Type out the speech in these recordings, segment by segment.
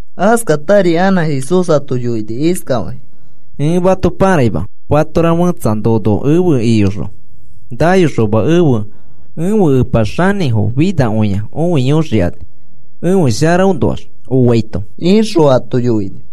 Askatari anã Jesús ato yoini iskafakĩ: “Ẽ mato pãraima, fatora fẽtsa nono efe iyoxõ nayoxoma ẽfe Epa xanĩfo finakõia õiyoxikani ãfe sharaõnoax oaito,” ixõ ato yoini.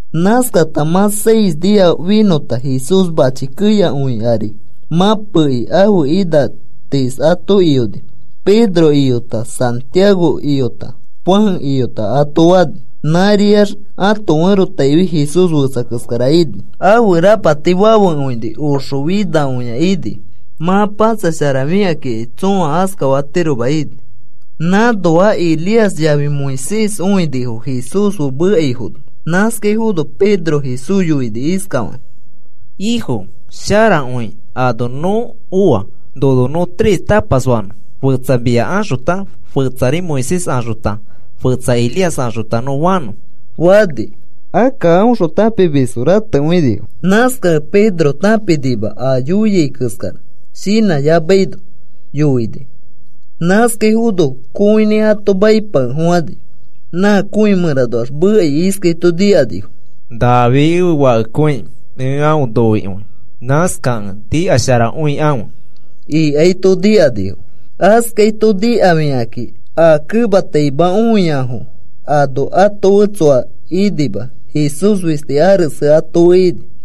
Nãskata mã seis nia finõta, Jesús mãchi keyakõi ari mãpekĩ ãfe ina tiis ato iyoni. Pedro iyota, Santiago iyota, Juan iyota ato fani. Nãriax ãto ferotaifi Jesús fetsa keskara ini. Ãfe rapati fafekõini oxo finakõia ini, mã patsasharafikakĩ tsõa askafatiroma ini. Nãnoa Elías yafi Moisés õinifo Jesús fe mekaifono. Nãskaifono Pedro Jesús yoini iskafakĩ: “Ifo, sharakõi ano nõ oa. Nono nõ tres tapas fanõ, fetsa mia axota, fetsa Moisés axota, fetsa Elías axota, nõ fanõ,” fani. Akka aõxõ tãpimisfo ratekõinifo. Nãskakẽ Pedro tãpinima a yoiai keskara, shinãyamaino yoini. Nãskaifono kõinĩ ato maipakefofãni. Nã kõi mẽranoax mekai iskaito nikanifo: “Nafi ẽfe Fakekõiki ẽ aõ noikõi. Nãskakẽ nikasharakõikãfe,” ikaito nikanifo. Askaito nikafikakĩ, a kemataima õiafo ano ato fe tsoa inima, Jesús fisti ares ato fe ini.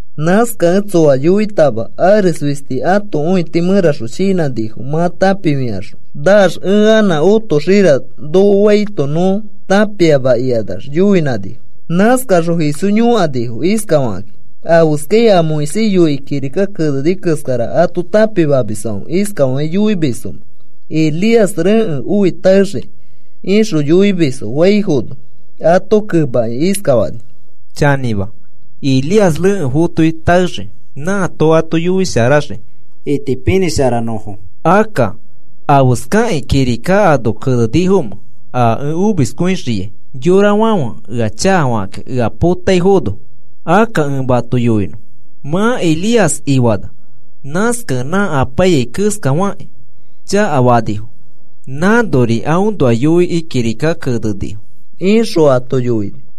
Nãskakẽ tsoa yoitama. Ares fisti ãto õiti mẽraxõ shinãnifo mã tãpifikaxõ. Naax ẽ anã otoxira nokofaito nõ tãpiama ikanax yoinãnifo. Nãskaxõ Jesús yõkanifo, iskafakakĩ: “¿Afeskakĩ a Moisés yoikĩ kirika keneni keskara ato tãpimamisfãfe iskafakĩ yoimisfomẽ Elías rekẽ oi taexii?” ixõ yoimisfo faifono, ato kemakĩ iskafani: “Chanĩma, Elías rekẽ fotoi taexii, nãato ato yoisharaxii itipinĩsharanõfo. Akka, ¿afeskakĩ kirika ano kenenifomẽ, a ẽ omiskõixiai yorafãfe ea chakafakakĩ ea potaifono? Akka ẽ mato yoinõ mã Elías ifana. Nãskakẽ nã apaiyai keskafakakĩ chakafanifo. Nãnori aõnoa yoikĩ kirika kenenifo,” ixõ ato yoini.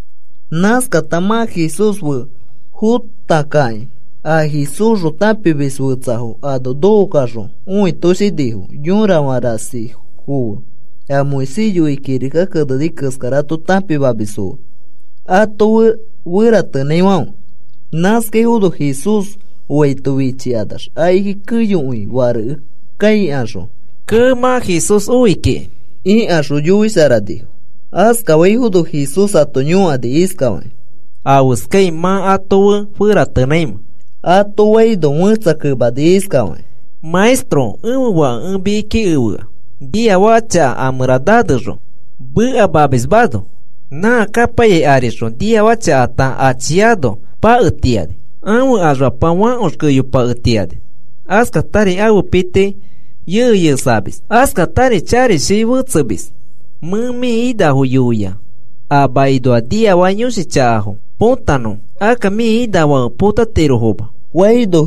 Nãskata mã Jesús fe fõtakakĩ a Jesúsxõ tãpimis fetsafo ano nokokaxõ õitoshinifo yõrafã rasifo fe a Moisés yoikĩ kirika keneni keskara ato tãpimamisfo fe ato fe feratenãifãfe. Nãskaifono Jesús oaito fichikanax akiki keyokõi farekefaikaxõ, “Kee, mã Jesús oi kiki,” ikaxõ yoisharanifo. Askaifono Jesús ato yõkani iskafakĩ: “¿Afeskai mã ato fe feratenãimẽ?” ato faino, fẽtsa kemani iskafakĩ: “Maestro, ẽfe fake ẽ mikiki efea, niafaka chaka a mẽra nanexõ mekamamismano. Nã kapaiyai arixõ, niafaka chakata achiano paketiani. Ãfe axfapa fãkox keyopaketiani, askatari ãfe piti yeyexamis, askatari charishi fetsemis. Mẽ mĩ inafo yoia a makinoa niafaka yõshi chaka põtanõfo. Akka mĩ inafãfe atirofoma,” faino,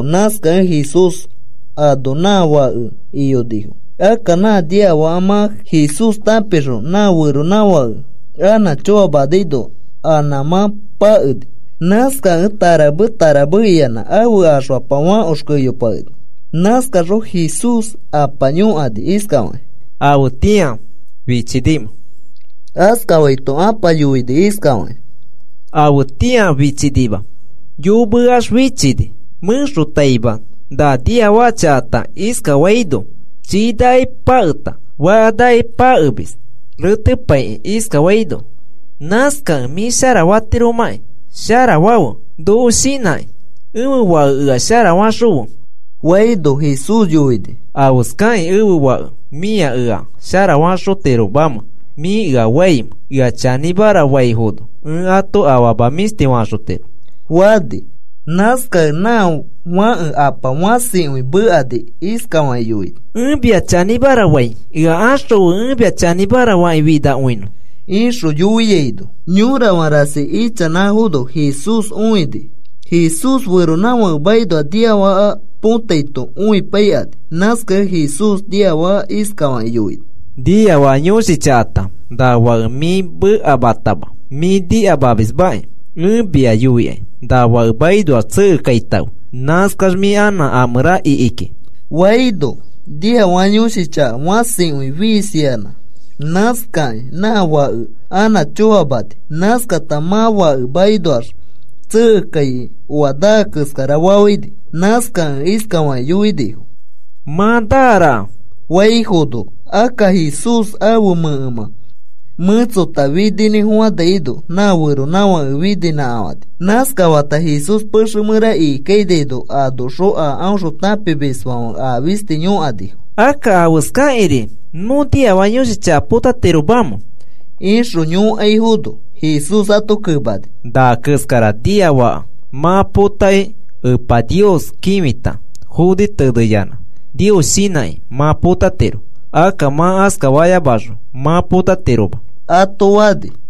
nãskakẽ Jesús ano nã fake iyonifo. Akka nã nĩafaka mã Jesús tãpixõ, nã feronãfake anã choamanaino anã nãmã pakeni. Nãskakẽ tarame tarame iyanã ãfe axfapa fãkox keyopakeni. Nãskaxõ Jesús apa yõkani iskafakĩ: “¿Afetĩa fichinimẽ?” iskaifaito, apa yoini iskafakĩ: “Afetĩa fichinima. Yomeax fichini. Mẽxotaima na niafaka chakata iskafaino, chiinaki paketa fakanaki pakemis, retepaikĩ iskafaino. Nãskakẽ mĩ sharafatiromakĩ sharafafe, noko shinãkĩ ẽfe fake ea sharafaxõfe,” faino, Jesús yoini: “¿Afeskakĩ ẽfe fake mĩa ea sharafaxotiromamẽ mĩ ea faimẽ? Ea chanĩmara faifono ẽ ato afama mĩshti faxotiro,” fani. Nãskakẽ nã fake ãpa fãsikõi mekani iskafakĩ yoini: “Ẽ mĩa chanĩmara fai, ea axõfe ẽ mia chanĩmara fakĩ finakõinõ,” ixõ yoiaino, yõrafã rasi ichanãfono Jesús õini, Jesús feronãfake makinoa niafaka potaito õipaikani. Nãskakẽ Jesús niafaka iskafakĩ yoini: “Niafaka yõshi chakata, na fake mĩ mekamatama, mĩ nikamamismaki, ẽ mia yoikai na fake makinoax tsekekaitãfe, nãskax mĩ anã a mẽra ikiki,” faino, niafaka yõshi chaka fãsikõi fiisini. Nãskakĩ nã fake anã choamani. Nãskata mã fake makinoax tsekekaikĩ oa naa keskara fafãini. Nãskakẽ iskafakĩ yoinifo: “Mã naa raka,” faifono, akka Jesús ãfe mẽkemã mẽtsota fininĩfofanaino nã feronãfake niinãkafãni. Nãskafata Jesús pexe mẽra ikikainano, anoxõ a aõxõ tãpimisfãfe a fisti yõkanifo: “Akka, ¿afeskakĩri nõ niafaka yõshi chaka potatiromamẽ?” ixõ yõkaifono, Jesús ato kemani: “Na keskara niafaka mã potakĩ Epa Nios kĩfita foni teneyanã Nios shinãkĩ mã potatiro. Akka mã askayamaxõ mã potatiroma,” ato fani.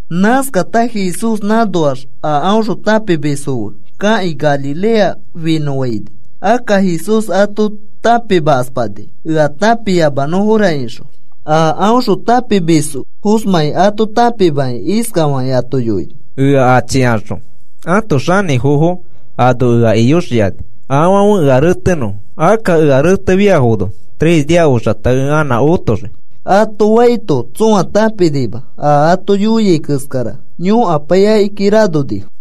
Nãskata Jesús nãnoax a aõxõ tãpimisfo fe kakĩ Galilea finõfaini. Akka Jesús ato tãpimakaspani, “Ea tãpiyamanõfora,” ixõ. A aõxõ tãpimisfoosmãi ato tãpimakĩ iskafakĩ ato yoini: “Ea achikaxõ ãto xanĩfofo ano ea iyoxikani, afãfe ea retenõfo. Akka ea retefiafono tres nia oxata ẽ anã otoxii,” ato faito, tsõa tãpinima a ato yoiai keskara. Yõkapai akiki ranonifo.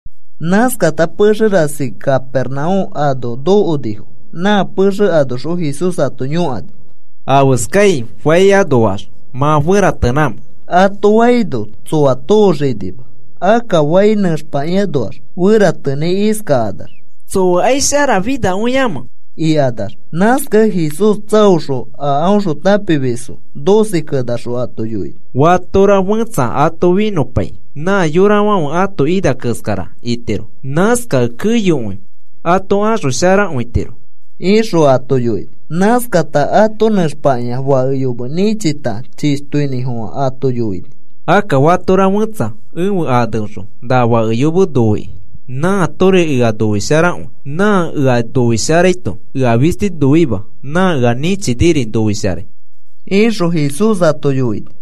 Nãskata pexe rasi Capernaúm ano nokonifo. Nã pexe anoxõ Jesús ato yõkani: “¿Afeskai fai anoax mã feratenãmẽ?” ato faino, tsoa tooxinima, akka fai nẽxpakĩanoax feratenãi iskakanax: “¿Tsoakai sharafinakõiamẽ?” ikanax. Nãskakẽ Jesús tsaoxõ a aõxõ tãpimisfo doce kenaxõ ato yoini: “Fatora fẽtsa ato finõpai nã yorafãfe ãto ina keskara itiro, nãskakẽ keyokõi ato axosharakõitiro,” ixõ ato yoini. Nãskata ato nẽxpakĩa fake yome nĩchita, chishtoinĩfofã ato yoini: “Akka fatora fẽtsa ẽfe aneõxõ na fake yome noikĩ nãatori ea noisharakõi. Nã ea noisharaito ea fisti noima, nã ea nĩchiniri noisharai,” ixõ Jesús ato yoini.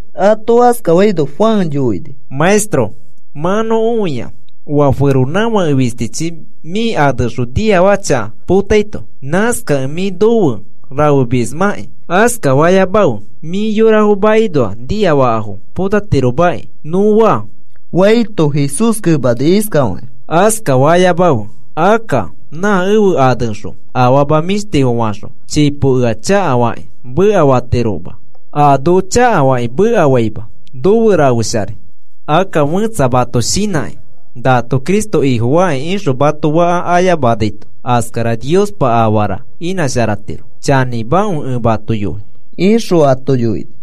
Ato askafaito Juan yoini: “Maestro, mã nõ õia oa feronãfake fistichi mĩ aneõxõ niafaka chaka potaito. Nãskakẽ mĩ nofe rafemismaki, askafayamafe mĩ yorafo makinoa niafaka potatiromaki nõ faa,” faito, Jesús kemani iskafakĩ: “Askafayamakãfe. Akka nã ẽfe aneõxõ afama mĩshtifo faxõ chipo ea chakafakĩ mekafatiroma. A noko chakafakĩ mekafaima, nofe rafesharai. Akka fẽtsa mato shinãkĩ, nato Cristo Ifofaki ixõ mato faka ayamanaito, askara Niospa afara inãsharatiro. Chanĩmakõi ẽ mato yoi,” ixõ ato yoini.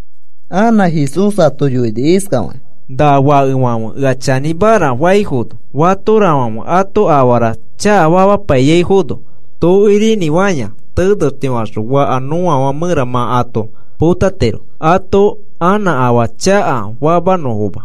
Anã Jesús ato yoini iskafakĩ: “Na fakefãfe ea chanĩmara faifono, fatorafãfe ato afara chakafamaifono, tokirinĩfaya tenextifaxõ fakafã nõafã mẽra mã ato potatiro ato anã afaa chakafamanõfoma.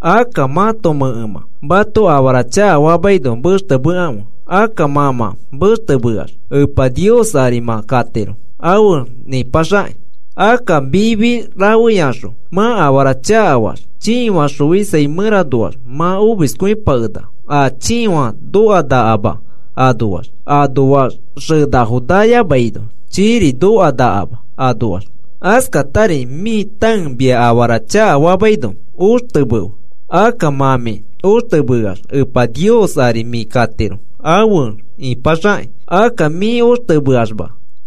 Akka mãto mẽkemã mato afara chakafamaino mextemekãfe. Akka mã mã mextemeax Epa Nios ari mã katiro afe nĩpaxakĩ. Akka mifi rafeyaxõ mã afara chakafaax chiifã xoisai mẽranoax mã omiskõipakenaka, a chiifã nokanakama anoax. Anoax xenafo nayamaino, chiiri nokanakama anoax. Askatari mĩ tãe mia afara chakafamaino oxtemefe. Akka mã mĩ oxtemeax Epa Nios ari mĩ katiro afe ĩpaxakĩ. Akka mĩ oxtemeamax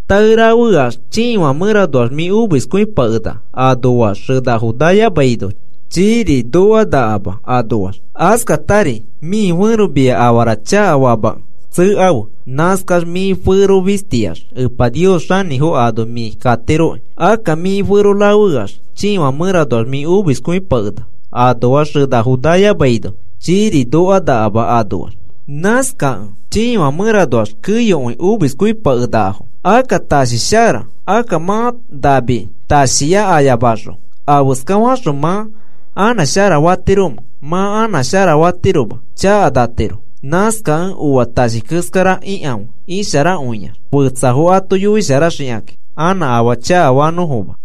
tae rafeyax chiifã mẽranoax mĩ omiskõipakenaka, anoax xenafo nayamaino, chiiri nokanakama anoax. Askatari mĩ fẽro mia afara chakafamakẽ tsekafe. Nãskax mĩ fero fistiax Epa Nios xanĩfo ano mĩ katiroki. Akka mĩ fero rafeyax chiifã mẽranoax mĩ omiskõipakenaka. Anoax xenafo nayamaino chiiri nokanakama anoax. “Nãskakẽ chiifã mẽranoax keyokõi omiskõipakenakafo. Akka tashi shara. Akka mã nami tashiya ayamaxõ, afeska faxõ mã anã sharafatiromẽ, mã anã sharafatiroma, chakanatiro. Nãskakẽ oa tashi keskara ikãfe isharakõiax. Fetsafo ato yoisharaxikakĩ anã afaa chakafanõfoma.”